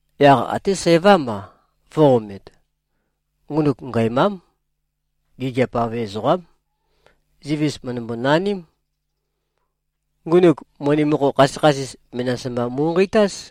Yaq até sævám-a, vø̄-omet. Ngunuk ngæmám. Gigiap-av ezoqám. Zivis mø̀ndømbo-naním. Ngunuk moni mokho khasøkhasis menas mba mu꞉nqeitáz.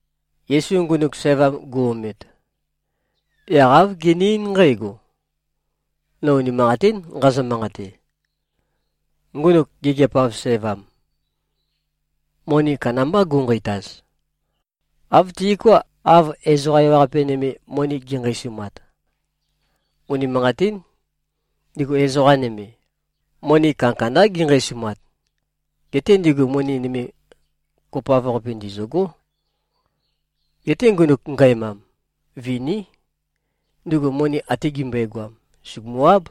Yesu ngunuk sævam gu-omet, yaq āv gene-eín nqǽgo, “No unimanqatín nqazø-manqate. Ngunuk gigiap-av sævam, moni kandambá gu꞉nqeitaz, āv tiuká, av ezoqa ewaqape nøme, moni gi꞉nqeisumat. Unimanqatín. Ndigu ezoqa nøme, moni kandakandá ginqeisumat. Geté ndigu moni nøme kopoav-qapi ndizø̂gó. Geté ngunuk ngæmam, viní. Ndugu moni ate gimbøegoam, sùgumu-áb.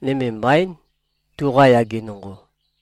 Nøme mbaín, tuqa yage nonqo.”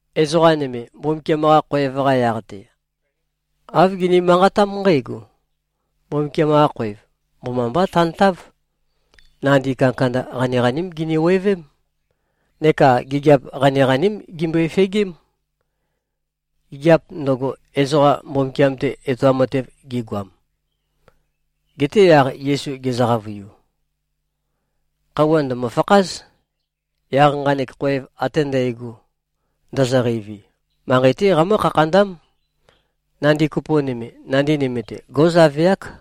Ezoqa nøme, Mbumbukiam-qa khoev-qa yaq-te, āv gini-manqatám nqǽgo, “Mbumbukiam-qa khoev mbomambá tantáv. Nandi kandakanda qaniqaním giniwevém. Neka gigiap qaniqaním gimbøe-fegém, gigiap ndøgo, ezoqa Mbumbukiam-te etoam matev gi꞉goam.” Geté yaq Yesu gezø-qavøiu, “Khøuwa ndø̀mø-fakház. Yaq nqanek khoev ate ndægo, ndozoqeivi, manqei-té qamǿ-khakhandám. Nandi kopo nøme, nandi nøme-te, gó꞉zaveák.”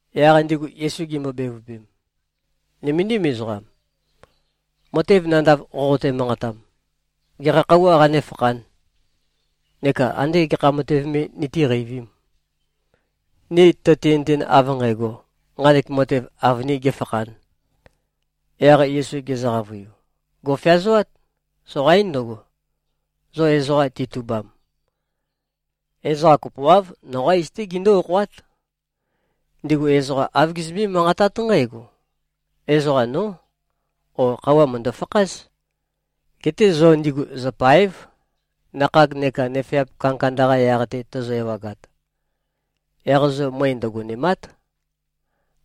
Yaq ndigu Yesu gimbo-bevøpem, “Nøméndim ezoqam. Matev nandav, qoqote-manqatam, gekha khøuwā qanéfakhān? Neka andé gekha matev me nitíqeivīm, ni tøtinøten, av nqægo, nqanek matev avønīn gēfakhān?” Yaq Yesu gezø-qavøiu, “Gò꞉feazoát. Soqaín ndøgo, zo ezoqa titubam. Ezoqa kopoáv, noqá iz-té gindú-okhoát. Ndigu ezoqa āv gizømbé-manqatát nqǽgo, ‘Ezoqa, nó’, ó, ‘Khøuwa mø̀ndø-fakház.’ Geté zo ndigu zø̀pae᷄v. Nakhag neka nøfeap kandakanda-qa yaq-te tozo-ewagat, yaq zo møe ndøgonèma᷄t.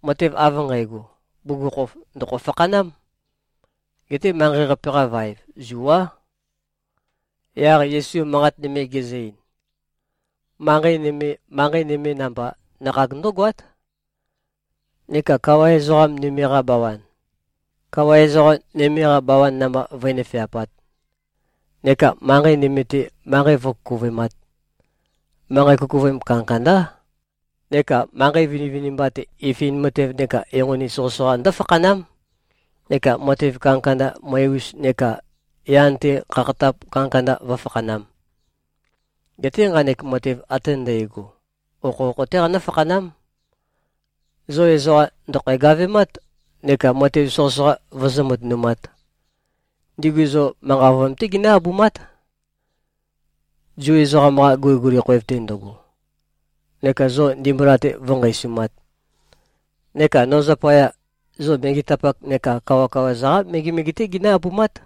Matev av nqægo, bugukhokhof ndø̀kho-fakhanám. Geté manqei-qape-qa vaev, zuá.” Yaq Yesu manqat nøme gezø-ein, “Manqei nøme, manqei nøme namba, nakhag ndǿgoát, neka kawa ezoqa nøme-qa bawan, kawa ezoqa nøme-qa bawan namba, vǿnøfeapāt, neka manqei nøme-te, manqei vǿkukuvøemāt. Manqei kukuvøem kandakandá. Neka manqei vinivinimba-te, ifin matev neka enqoni soqøsoqa ndǿfakhanám, neka matev kandakanda møe-us neka yan-te khakhatap kandakanda vǿfakhanām. Geté nqanek matev ate ndægo, okhokho-té qanǿ-fakhanám. Zo ezoqa ndø̀khæ-gavemat neka matev soqøsoqa vøzǿ-matønumāt. Ndigu zo manqa ovøyam-té ginǿ-abumát, Zu ezoqam-qa guliguli khoev-te ndøgo, neka zo ndimbula-te vǿnqeisumāt. Neka no zapaya, zo megetapak neka kawakawa-za-qá megemege-té ginǿ-abumát.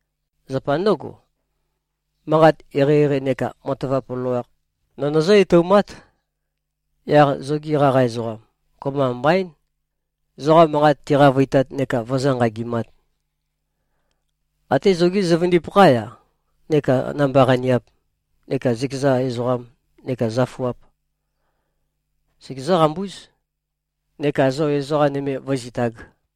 Zapa ndǿgo, manqat eqeieqei neka matavap loloakh, nō nøzǿ-etoumát. Yaq zogi qaqa ezoqam, kopømba mbaín, zoqa manqat tiqavøitat neka vøzǿ-nqagimāt. Até zogí zøvøndipakhá-ya neka namba-qaniap neka zøkeza ezoqam neka zøfuap, segezǿ-qambúz, neka zo ezoqa nøme vǿzitāg.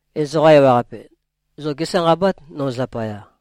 Ezoqa ewaqape zo gésanqabát, no zapaya.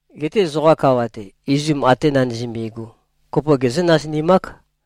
Geté zoqa kawa-te, izum ate nandizømbi꞉gu, kopo gezǿ-nasinimák.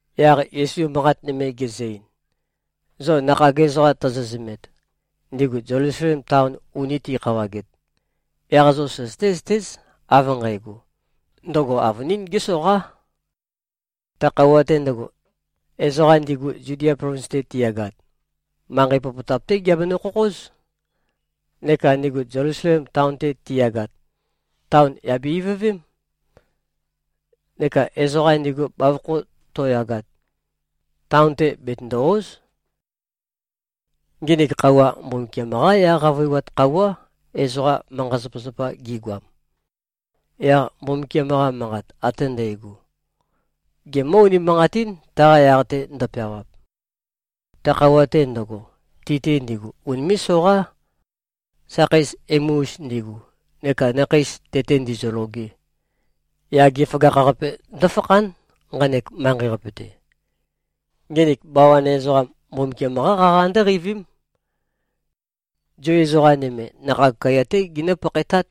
Yaq Yesu manqat nøme gezø-ein, “Zo nakhag ezoqa tozo-zømet, ndigu Zelusalem taon uni ti꞉khawaget, yaq zo søzøté-zøtéz, av nqægo, ndøgo avønín gésoqá. Ta khøuwa-te ndøgo, ezoqa ndigu Zudia plovins-te tiyagat, manqei popotap-té giabenø-khokhóz. Neka ndigu Zelusalem taon-te tiyagat, taon yà be-ivøvém. Neka ezoqa ndigu bavokho to꞉yagat, taon-te betøndò-o᷄z. Nginik khøuwa, Mbumbukiam-qá yaq qavøiwat khøuwá, ezoqa manqa-zapazapa gi꞉goam. Yaq Mbumbukiam-qa Manqat ate ndægo, gemǿ-unimanqatín, taqa yaq-te ndøpeawap. Ta khøuwa-te ndøgo, ti-te ndigu unimé꞉-soqá, sakheis emu-us ndigu neka nakhei tete ndizøloge. Yage føgakh-qape ndǿfakhán, nqanek manqei-te. Nginik bawan ezoqam, Mbumbukiam-qá qaqa ndǿqeivím. Zu ezoqa nøme, nakhag kaiya-té ginǿ-pakhaetát,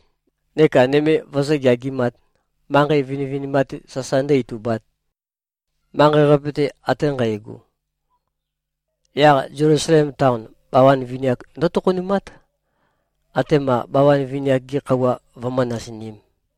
neka nøme vøzǿ-geagimāt, manqei vinivinimba-te sasa ndǿ-itubāt, manqei-qape-te ate nqægo. Yaq Zelusalem taon, bawan vini-ak ndǿtokhonumát, atema bawan vini-ak-gi khøuwa vømǿ-nasinīm.”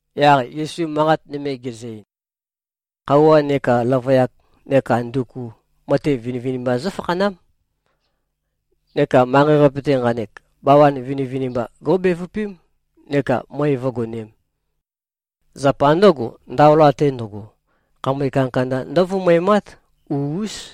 Yaq Yesu manqat nøme gezø-ein, “Khøuwa neka løvøyak neka nduku, matev vinivinimba zǿfakhanám. Neka manqei-qape-te nqanek, bawabawan vinivinimba gó꞉bevøpém neka møe vǿgonēm. Zapa ndǿgo, ndaola-te ndøgo, khamøe kandakanda ndǿvumøemát. U-ús.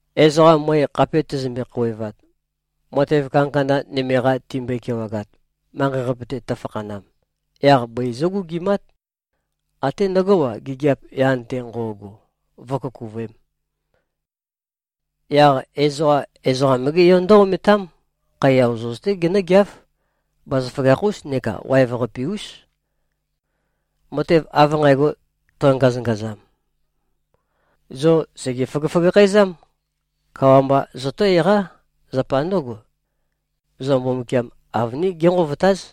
Ezoqa møe khape tøzømbe-khouwevat, matev kandakanda nøme-qa timbøe-kewagat, manqei-qape-te tøfakhanam, yaq bøi zǿgugimát. Até ndøgó-a, gigiap yan-te nqo꞉go, vǿkukuvøēm. Yaq ezoqa, Ezoqam-gé Yo ndǿ-ometám. Khaiya ozoz-té genǿgeáv. Bazaføgakh-ús neka waev-qape-ús. Matev av nqægo tøngazøngazam, zo sège-føgøføgakhæzám. Kawa mba zotó-eqá. Zapa ndǿgo, zo Mbumbukiam avønín génqovotáz.”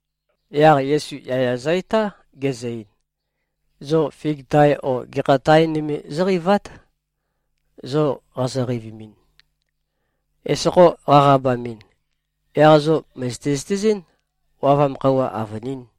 Yaq Yesu yaya zø-etá, gezø-ein, “Zo fig tae o gekha tae nøme zóqeivát. Zo qazo-qeivimin, esokho qaqabamɨn, yaq zo mø̀zøte-zøtezɨ́n, wavam khøuwa avønín.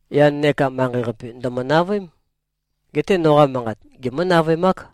Yan neka manqei-qape ndø̀mø-navøém. Geté noqa manqat, gemǿ-navøemák.”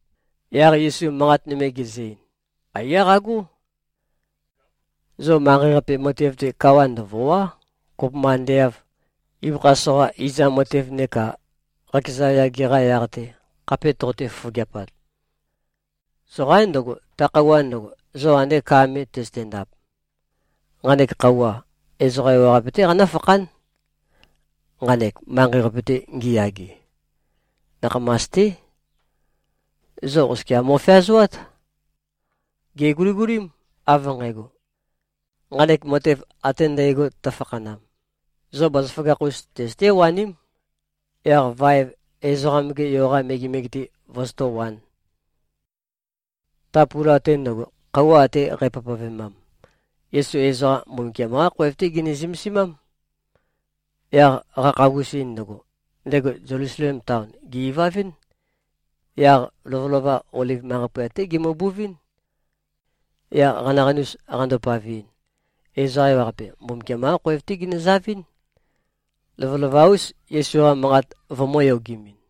Yaq Yesu manqat nøme gezø-ein, “Aiyá qagó. Zo manqei-qape matev-te, kawa ndøvòa᷄, kopømba ande av ibøkha soqa izam matev neka qakeza yage-qa yaq-te khape toqote-fofogeapat. Soqaín ndøgo, ta khøuwa ndøgo, zo ande ka me tøzøte-ndap. Nqanek khøuwa, ezoqa ewaqape-té qanǿfakhán, nqanek manqei-qape-te ngiyage. Nakhamas-té. Zo oskia mo꞉feazoát. Gèguligulím, av nqægo, nqanek matev ate ndægo tøfakhanam, zo bazaføgakh-us tøzøté-waním, yaq vaev Ezoqam-ge Yo-qa megemege-te vozotó-wān.” Ta pula-te ndøgo, khøuwa ate qæpavpavemam, Yesu ezoqa Mbumbukiam-qá khoev-té gene-zømesimám. Yaq qakhagusin ndøgo, ndego Zelusalem taon, gè-ivavɨ́n. Yaq lovølova, Oliv manqei poyat-té gemøbuvɨ́n. Yaq qanaqanus qando-paveɨn, ezoqa ewaqape, Mbumbukiam-qá khoev-té ginøzavɨ́n, lovølova-ús, Yesu-qa manqat vømǿ-yogemɨn.